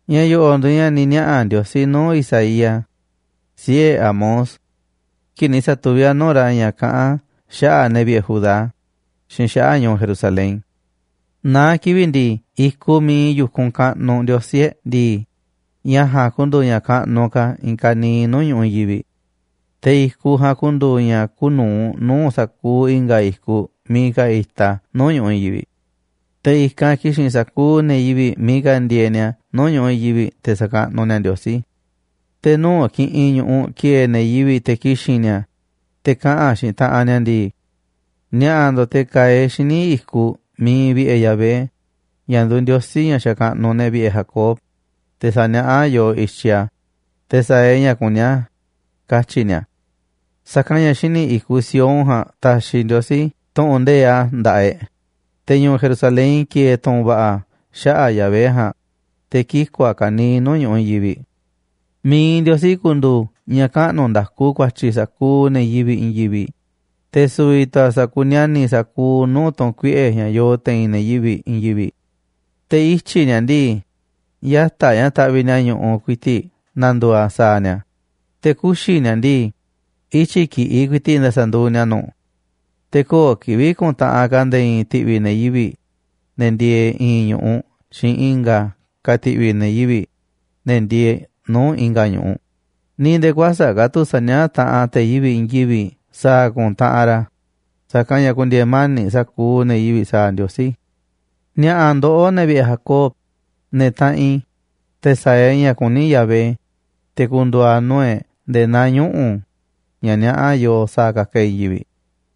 Ña̱ yo̱ꞌo̱ꞌ nduuꞌ ña̱ ni̱ niaꞌa̱ Ndiosí nuu̱ꞌ Isaías, siꞌe̱ Amoz, kii̱ꞌ ni̱ sa̱tuví a̱ nuu̱ꞌ ra̱ ña̱ kaꞌán a̱ xaꞌa̱ꞌ ne̱ vi̱ꞌe̱ Judá xiinꞌ xaꞌa̱ꞌ ñu̱u̱ Jerusalén. Naá kivi̱ꞌ ndii, i̱kuꞌ miiꞌ iinꞌ yu̱kunꞌ kaꞌnuꞌ Ndiosí e̱ꞌ ndii, ña̱ ja̱a̱nꞌ ku̱ndu̱u̱ ña̱ kaꞌnuꞌ ka̱ i̱i̱n kaniiꞌ nuu̱ꞌ ñu̱ꞌuꞌ i̱i̱n yivi̱ꞌ. Te̱ i̱kuꞌ ja̱a̱nꞌ ku̱ndu̱u̱ ña̱ kuuꞌ nu̱uꞌ nuu̱ꞌ sa̱kuuꞌ i̱nga̱ i̱kuꞌ miiꞌ ka̱ itaꞌ a̱ nuu̱ꞌ ñu̱ꞌuꞌ i̱i̱n yivi̱ꞌ. Te̱ i̱kanꞌ ki̱xi̱n sa̱kuuꞌ ne̱ yivi̱ꞌ miiꞌ ka̱ ndieeꞌ ni̱a̱ nuu̱ꞌ ñu̱ꞌuꞌ i̱i̱n yivi̱ꞌ, te̱ sa̱kaꞌnuꞌ ni̱a̱ Ndiosí. Te̱ nuu̱ꞌ kiꞌinꞌ ñu̱ꞌuꞌ ki̱e̱e̱ ne̱ yivi̱ꞌ te̱ ki̱xi̱n ni̱a̱, te̱ kaꞌa̱n xiinꞌ taꞌanꞌ ni̱a̱ ndii: “Ni̱a̱ꞌa̱ ndo̱ꞌ te̱ ka̱a̱ e̱ꞌ xíniꞌ i̱kuꞌ miiꞌ iinꞌ vi̱ꞌe̱ Yahvé, ña̱ nduuꞌ Ndiosí ña̱ xakaꞌnuꞌ ne̱ vi̱ꞌe̱ Jacob, te̱ sa̱niaꞌá a̱ yooꞌ i̱tyiꞌ a̱, te̱ sa̱a̱ e̱ꞌ ña̱ kuní a̱”, katyi̱ ni̱a̱. Sa̱kanꞌ ña̱ xíniꞌ i̱kuꞌ Sión ja̱a̱nꞌ ta̱xi̱ Ndiosí tu̱ꞌu̱n nde̱iꞌ a̱ nda̱ꞌaꞌ e̱ꞌ, te̱ ñu̱u̱ Jerusalén ki̱e̱e̱ tu̱ꞌu̱n va̱ꞌa̱ xaꞌa̱ꞌ Yahvé ja̱a̱nꞌ, te̱ kiku̱ a̱ ka̱niiꞌ nuu̱ꞌ ñu̱ꞌuꞌ i̱i̱n yivi̱ꞌ. Mi̱iꞌ Ndiosí ku̱ndu̱u̱ ña̱ kaꞌnu̱ nda̱ku ku̱a̱tyi̱ sa̱kuuꞌ ne̱ yivi̱ꞌ i̱i̱n yivi̱ꞌ, te̱ su̱vi̱ tu̱ a̱ sakuni̱a̱ni̱ sa̱kuuꞌ nuu̱ꞌ tu̱n kuiꞌe̱ ña̱ yoo te̱i̱n ne̱ yivi̱ꞌ i̱i̱n yivi̱ꞌ. Te̱ ityi̱ ni̱a̱ ndii, yata̱ꞌ ña̱ taꞌviꞌ ni̱a̱ ñu̱ꞌuꞌ ku̱i̱ti̱ꞌ na̱ndu̱u̱ a̱ sa̱a̱ ni̱a̱, te̱ kuxi̱ ni̱a̱ ndii, ityi̱ ki̱ꞌiꞌ ku̱i̱ti̱ꞌ nda̱sa̱ nduuꞌ ni̱a̱ nu̱ꞌ. Te̱ köo̱ꞌ kivi̱ꞌ ku̱ntaꞌanꞌ ka̱ nde̱e̱ i̱i̱n ti̱ꞌvi̱ ne̱ yivi̱ꞌ, ne̱ ndieeꞌ i̱i̱n ñu̱ꞌuꞌ xiinꞌ i̱nga̱ ka̱ ti̱ꞌvi̱ ne̱ yivi̱ꞌ, ne̱ ndieeꞌ nuu̱ꞌ i̱nga̱ ñu̱ꞌuꞌ, ni̱ nde̱e̱ kuäsa̱ꞌ ka̱ tu̱ sa̱niaꞌá taꞌanꞌ te̱ yivi̱ꞌ i̱i̱n yivi̱ꞌ sa̱a̱ ku̱ntaꞌanꞌ ra̱, sa̱kanꞌ ña̱ ku̱ndi̱e̱e̱ mani̱ꞌ sa̱kuuꞌ ne̱ yivi̱ꞌ sa̱a̱ Ndiosí. Ni̱a̱ꞌa̱ ndoꞌó, ne̱ vi̱ꞌe̱ Jacob, ne̱ taꞌanꞌ i̱, te̱ sa̱a̱ e̱ꞌ ña̱ kuní Yahvé, te̱ ku̱ndu̱u̱ a̱ nuu̱ꞌ e̱ꞌ nde̱e̱ naa ñuꞌu̱ ña̱ niaꞌá yooꞌ sa̱a̱ ka̱ka̱ e̱ꞌ i̱i̱n yivi̱ꞌ.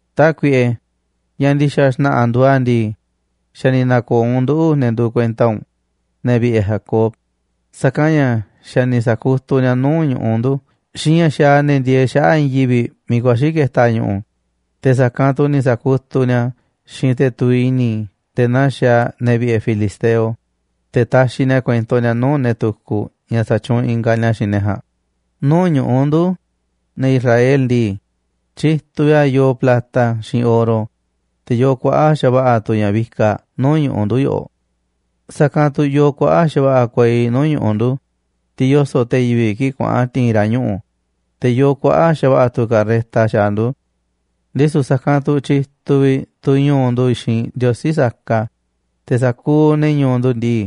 Tákuiꞌe, ña̱ ndi̱xa̱ xna̱ꞌa̱ nduuꞌ a̱ ndii, xa̱ ni̱ na̱ko̱o̱ u̱nꞌ nduꞌu̱, ne̱ nduuꞌ kuenta u̱nꞌ, ne̱ vi̱ꞌe̱ Jacob, sa̱kanꞌ ña̱ xa̱ ni̱ sa̱kutuꞌ ni̱a̱ nuu̱ꞌ ñu̱ꞌuꞌ ndu̱ xiinꞌ ña̱ xaaꞌ ne̱ ndieeꞌ xaꞌa̱ꞌ i̱i̱n yivi̱ꞌ miiꞌ ku̱a̱xi̱ ke̱ta̱ ñu̱ꞌu̱, te̱ sa̱kanꞌ tu̱ ni̱ sa̱kutuꞌ ni̱a̱ a̱ xiinꞌ te̱ tuviꞌ i̱ni̱ nde̱e̱ naa xaaꞌ ne̱ vi̱ꞌe̱ filisteo, te̱ taxiꞌ ni̱a̱ kuento ni̱a̱ nuu̱ꞌ ne̱ tukuꞌ ña̱ satyuunꞌ ingaꞌ ni̱a̱ xiinꞌ ne̱ ja̱a̱nꞌ. Nuu̱ꞌ ñu̱ꞌuꞌ ndu̱, ne̱ Israel ndii, tyituꞌ vi̱ꞌ a̱ yoo plata xiinꞌ oro, te̱ yoo kuaꞌa̱ꞌ xa̱va̱ꞌa̱ tu̱ ña̱ vikaꞌ nuu̱ꞌ ñu̱ꞌuꞌ ndu̱ yoꞌoꞌ. Sa̱kanꞌ tu̱ yoo kuaꞌa̱ꞌ xa̱va̱ꞌa̱ kuei nuu̱ꞌ ñu̱ꞌuꞌ ndu̱, tiꞌ yoso̱ꞌ te̱ yivi̱ꞌ kii̱ꞌ kuaꞌa̱n ti̱i̱n ra̱ ñuꞌu̱, te̱ yoo kuaꞌa̱ꞌ xa̱va̱ꞌa̱ tu̱ carreta xaaꞌ ndu̱. Ndisu̱ sa̱kanꞌ tu̱ tyituꞌ vi̱ꞌ tu̱ ñu̱u̱ ndu̱ xiinꞌ ndiosí saka, te̱ sa̱kuuꞌ ne̱ ñu̱u̱ ndu̱ ndii,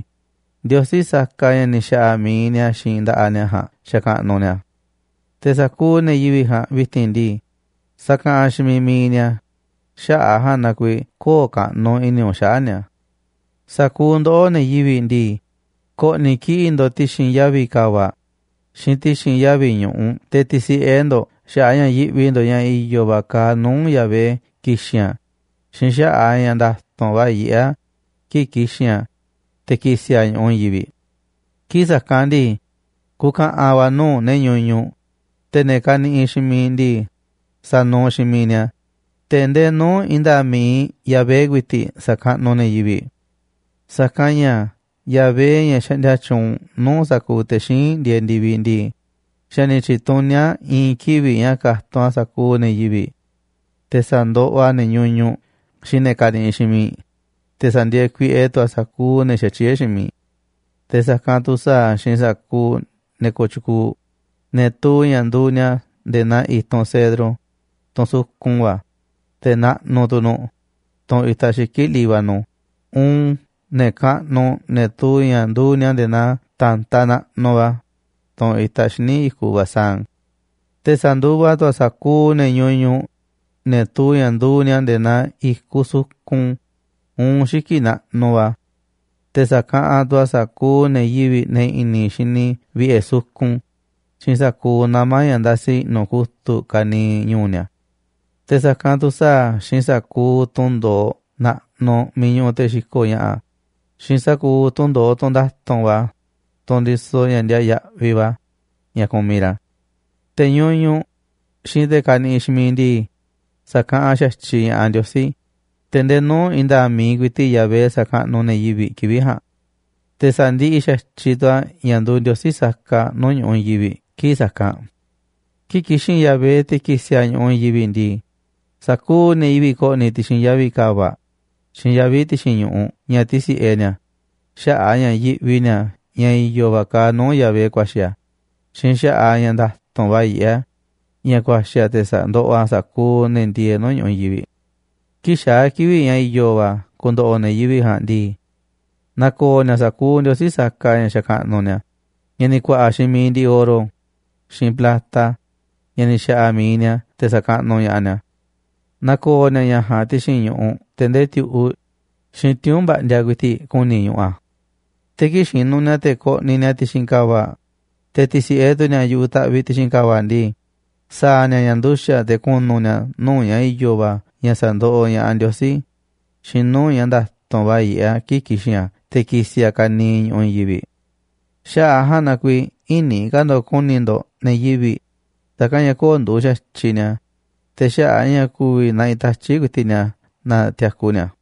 ndiosí saka ña̱ ni̱ xa̱ꞌa̱ mi̱iꞌ ni̱a̱ xiinꞌ nda̱ꞌaꞌ ni̱a̱ ja̱a̱nꞌ xakaꞌnuꞌ ni̱a̱. Te̱ sa̱kuuꞌ ne̱ yivi̱ꞌ ja̱a̱nꞌ vi̱ti̱n ndii, sakaꞌanꞌ xiinꞌ miiꞌ mi̱iꞌ ni̱a̱, xaꞌa̱ꞌ a̱ ja̱a̱nꞌ na kuiiꞌ kö̱o̱ꞌ kaꞌnuꞌ i̱ni̱ u̱nꞌ xaꞌa̱ꞌ ni̱a̱. Sa̱kuuꞌ ndoꞌó, ne̱ yivi̱ꞌ ndii, ko̱ꞌni̱ kiꞌi̱ꞌ ndo̱ꞌ ti̱xi̱n yavi̱ ka̱va̱ꞌ xiinꞌ ti̱xi̱n yavi̱ ñu̱ꞌuꞌ te̱ ti̱si̱ꞌe ndo̱ꞌ xaꞌa̱ꞌ a̱ ña̱ yiꞌvi ndo̱ꞌ ña̱ i̱yo̱ va̱ kaaꞌ nuu̱ꞌ Yahvé ki̱xi̱n a̱, xiinꞌ xaꞌa̱ꞌ a̱ ña̱ nda̱tu̱nꞌ va̱ yiꞌé a̱ kii̱ꞌ ki̱xi̱n a̱, te̱ ki̱si̱ a̱ ñu̱ꞌuꞌ i̱i̱n yivi̱ꞌ. Kii̱ꞌ sa̱kanꞌ ndii, ku̱ka̱ꞌa̱n va̱ nuu̱ꞌ ne̱ ñuñuꞌ, te̱ ne̱ kaniꞌiꞌ xiinꞌ miiꞌ ndii, sa̱nuuꞌ xiinꞌ miiꞌ ni̱a̱, te̱ ndee nuu̱ꞌ i̱i̱n nda̱a̱ꞌ mi̱iꞌ Yahvé ku̱i̱ti̱ꞌ sa̱kaꞌnuꞌ ne̱ yivi̱ꞌ. Sa̱kanꞌ ña̱ Yahvé, ña̱ xaꞌndia tyuunꞌ nuu̱ꞌ sa̱kuuꞌ te̱ xíinꞌ ndieeꞌ ndi̱viꞌ ndii, xa̱ ni̱ tyi̱tuní a̱ i̱i̱n kivi̱ꞌ ña̱ ka̱tunꞌ a̱ sa̱kuuꞌ ne̱ yivi̱ꞌ, te̱ sa̱ndoꞌoꞌ a̱ ne̱ ñuñuꞌ xiinꞌ ne̱ kaniꞌiꞌ xiinꞌ miiꞌ, te̱ sa̱ndi̱e̱e̱ kuiꞌe tu̱ a̱ sa̱kuuꞌ ne̱ xatyié xiinꞌ miiꞌ. Te̱ sa̱kanꞌ tu̱ sa̱a̱ a̱ xiinꞌ sa̱kuuꞌ ne̱ kooꞌ tyukuuꞌ, ne̱ tuu ña̱ nduuꞌ ni̱a̱ nde̱e̱ naa i̱tunꞌ cedro, tunꞌ sukun va̱, te̱ naꞌnuꞌ tu̱ nu̱ꞌ, tunꞌ itaꞌ xiki̱ꞌ Líbano, uun ne̱ kaꞌnuꞌ, ne̱ tuu ña̱ nduuꞌ ni̱a̱ nde̱e̱ naa ta̱ntaꞌ naꞌnuꞌ va̱, tunꞌ itaꞌ xíniꞌ i̱kuꞌ Basán. Te̱ sa̱nduva tu̱ a̱ sa̱kuuꞌ ne̱ ñuñuꞌ, ne̱ tuu ña̱ nduuꞌ ni̱a̱ nde̱e̱ naa i̱kuꞌ sukun uun xiki̱ꞌ naꞌnuꞌ va̱. Te̱ sa̱kaꞌanꞌ tu̱ a̱ sa̱kuuꞌ ne̱ yivi̱ꞌ ne̱ i̱ni̱ xini vi̱ꞌe̱ sukun xiinꞌ sa̱kuuꞌ nama̱ ña̱ ndasi i̱ꞌnu̱ kutu̱ꞌ ka̱niiꞌ ñu̱u̱ ni̱a̱. Te̱ sa̱kanꞌ tu̱ sa̱a̱ a̱ xiinꞌ sa̱kuuꞌ tunꞌ ndo̱oꞌ naꞌnuꞌ miiꞌ ñuꞌuꞌ te̱ xiko̱ꞌ ña̱ꞌa̱ xiinꞌ sa̱kuuꞌ tunꞌ ndo̱oꞌ tunꞌ nda̱tu̱nꞌ va̱, tunꞌ ndisoꞌ ña̱ ndiaa yaꞌviꞌ va̱ ña̱ kumiꞌ ra̱. Te̱ ñuñuꞌ xiinꞌ te̱ kaniꞌiꞌ xiinꞌ miiꞌ ndii, sa̱kaꞌanꞌ xa̱tyiꞌ ña̱ꞌaꞌ Ndiosí, te̱ ndee nuu̱ꞌ i̱i̱n nda̱a̱ꞌ mi̱iꞌ ku̱i̱ti̱ꞌ Yahvé sa̱kaꞌnuꞌ ne̱ yivi̱ꞌ kivi̱ꞌ ja̱a̱nꞌ. Te̱ sa̱ndiꞌiꞌ xa̱tyiꞌ tu̱ a̱ ña̱ nduuꞌ ndiosí saka nuu̱ꞌ ñu̱ꞌuꞌ i̱i̱n yivi̱ꞌ kii̱ꞌ sa̱kanꞌ. Kii̱ꞌ ki̱xi̱n Yahvé, te̱ ki̱si̱ a̱ ñu̱ꞌuꞌ i̱i̱n yivi̱ꞌ ndii, sa̱kuuꞌ ne̱ yivi̱ꞌ ko̱ꞌni̱ ti̱xi̱n yavi̱ ka̱va̱ꞌ xiinꞌ yavi̱ ti̱xi̱n ñu̱ꞌuꞌ ña̱ ti̱si̱ꞌe ni̱a̱ xaꞌa̱ꞌ a̱ ña̱ yiꞌvi ni̱a̱ ña̱ i̱yo̱ va̱ kaaꞌ nuu̱ꞌ Yahvé ku̱a̱xi̱ a̱ xiinꞌ xaꞌa̱ꞌ a̱ ña̱ nda̱tu̱nꞌ va̱ yiꞌé a̱ ña̱ ku̱a̱xi̱ a̱ te̱ sa̱ndoꞌoꞌ a̱ sa̱kuuꞌ ne̱ ndieeꞌ nuu̱ꞌ ñu̱ꞌuꞌ i̱i̱n yivi̱ꞌ. Kii̱ꞌ xaa̱ kivi̱ꞌ ña̱ i̱yo̱ va̱ ku̱ndo̱ꞌo̱ ne̱ yivi̱ꞌ ja̱a̱nꞌ ndii, na̱ko̱o̱ ni̱a̱ sa̱kuuꞌ ndiosí saka ña̱ xakaꞌnuꞌ ni̱a̱, ña̱ ni̱ ku̱a̱ꞌa̱ xiinꞌ mi̱iꞌ ndiꞌiꞌ oro xiinꞌ plata, ña̱ ni̱ xa̱ꞌa̱ mi̱iꞌ ni̱a̱ te̱ sa̱kaꞌnuꞌ ña̱ꞌaꞌ ni̱a̱. Na̱ko̱o̱ ni̱a̱ ña̱ ja̱a̱nꞌ ti̱xi̱n ñu̱ꞌuꞌ te̱ ndee ti̱u̱ꞌuꞌ xiinꞌ tiuu̱nꞌ mba̱ꞌndiaꞌ ku̱i̱ti̱ꞌ ku̱ni̱ ñuꞌuꞌ a̱. Te̱ kii̱ꞌ xinuꞌ ni̱a̱ te̱ koꞌniꞌ ni̱a̱ ti̱xi̱n ka̱va̱ꞌ, te̱ ti̱si̱ꞌe tu̱ ni̱a̱ yu̱ꞌuꞌ ta̱ꞌviꞌ ti̱xi̱n ka̱va̱ꞌ ndii, sa̱a̱ ni̱a̱ ña̱ nduxa̱ꞌ te̱ ku̱nu̱ ni̱a̱ nuu̱ꞌ ña̱ i̱yo̱ va̱ ña̱ sa̱ndoꞌoꞌ ña̱ꞌaꞌ Ndiosí xiinꞌ nuu̱ꞌ ña̱ nda̱tu̱nꞌ va̱ yiꞌé a̱ kii̱ꞌ ki̱xi̱n a̱ te̱ ki̱si̱ a̱ ka̱niiꞌ ñu̱ꞌuꞌ i̱i̱n yivi̱ꞌ. Xaꞌa̱ꞌ a̱ ja̱a̱nꞌ na kuiiꞌ ï̱ni̱ ka̱ ndo̱ꞌ ku̱ni̱ ndo̱ꞌ ne̱ yivi̱ꞌ, sa̱kanꞌ ña̱ köo̱ꞌ nduuꞌ xa̱tyiꞌ ni̱a̱, te̱ xaꞌa̱ꞌ a̱ ña̱ ku̱vi̱ naꞌiꞌ tatyi̱ꞌ ku̱i̱ti̱ꞌ ni̱a̱ na tiaku ni̱a̱.